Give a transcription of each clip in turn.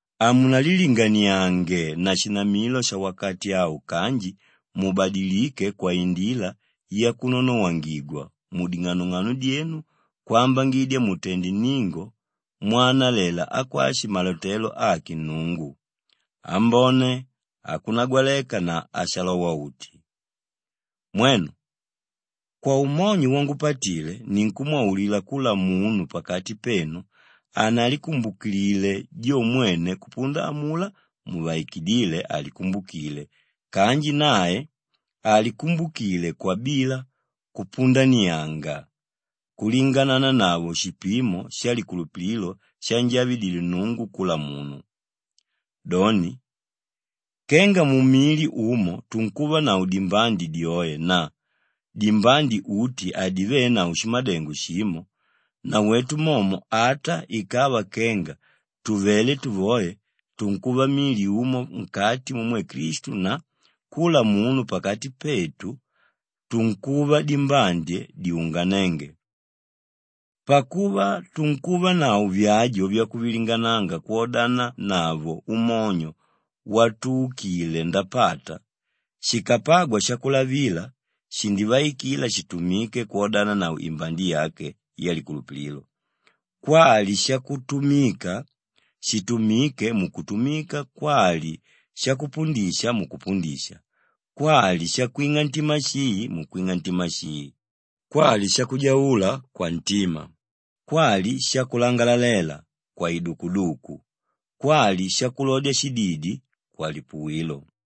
Hamunalilinganiange na shinamidyo shawakati au kanji mubadilike kwaindila yakunonowangigwa muding'anong'ano dyenu kwambangidya mutende nningo mwanalela akwashi malotelo ake Nnungu, ambone, akunagwaleka na ashalowa-uti. Mwenu, kwaumonyo wangupatile ninkumwaulila kula munu pakati penu hanalikumbukile jo mwene kupunda amulá muvaikidíle alikumbukilile kanji nae alikumbukile kwabila kupundanianga kulinganananavo shipimo shalikulupililo shanjavidile Nnungu kula munu. Doni, kenga mumili umo tunkuvanavo dimbande dyoe na dimbande uti hadivenavo shimadengo shimo, nawetu momo ata ikava kenga tuvelé tuvoe, tunkuva mili umo nkati mumwe Klistu na kula munu pakati petu tunkuva dimbande dyunganénge. Pakuva tunkuvanavo vyajo vyakuvilingananga kwodananavo umonyo watuukile ndapata, shikapagwa shakulavila, shindivaikila shitumike kwodananavo imbande yake yalikulupililo, kwali shakutumika, shitumike mukutumika kwali shakupundisha, mukupundisha, kwali shakwing'a ntima shii, mukwing'a ntima shii, Kwali: …shakulaililila, mukulaililila. kwali shakujaula, kwantima, kwali shakulangalalela, kwaidukuduku, kwali shakulodya shididi, kwalipuwilo.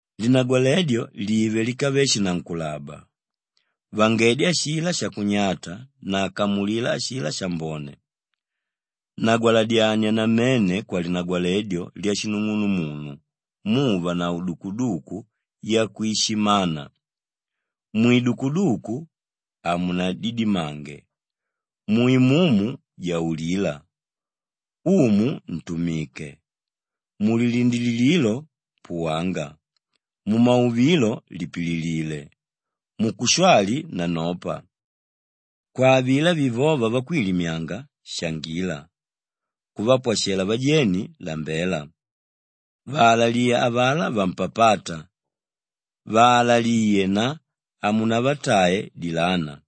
Linagwaledyo live líkave shinankulaba. Vangedya ashilá shakunyata na kamulila ashilá shambone. Nagwaladyania namene kwalinagwaledyo lyashinung'unumunu muuvanavo dukuduku yakwishimana. Mwidukuduku, hamunadidimange. Mu Imumu, jaulila. Umu, ntumike. Mulilindilililo, puwanga. Mumauvilo, lipililile. Mukushwali, nanopa. Kwa avilá vivóva vakwilimyanga, shangila. Kuvapwashalela vajeni, lambela. Vaalaliye avalá vampapáta, vaalaliye na hamunavatae dilana.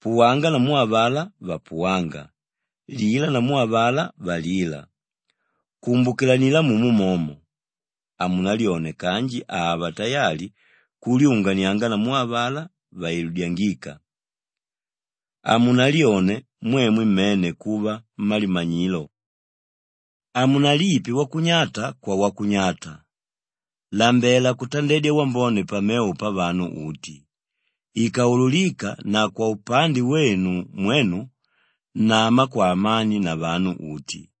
Puwanga namu avalá vapuwánga, lila namu avalá valíla. Kumbukilanila mumo momo. Hamunalyone kanji ava tayali kulyunganianga namu avalá vailudyangíka. Hamunalyone mwemwe mmene kuva mmalimanyilo. Hamunalipe wakunyata kwawakunyata. Lambela kutandedya wambone pamevo pavanu uti. Ikaululika na kwaupande wenu mwenu, nama kwaamani na vanu uti.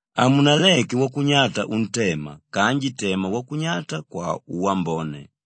Hamunaleke wakunyata untema kanji tema wakunyata kwauwambone.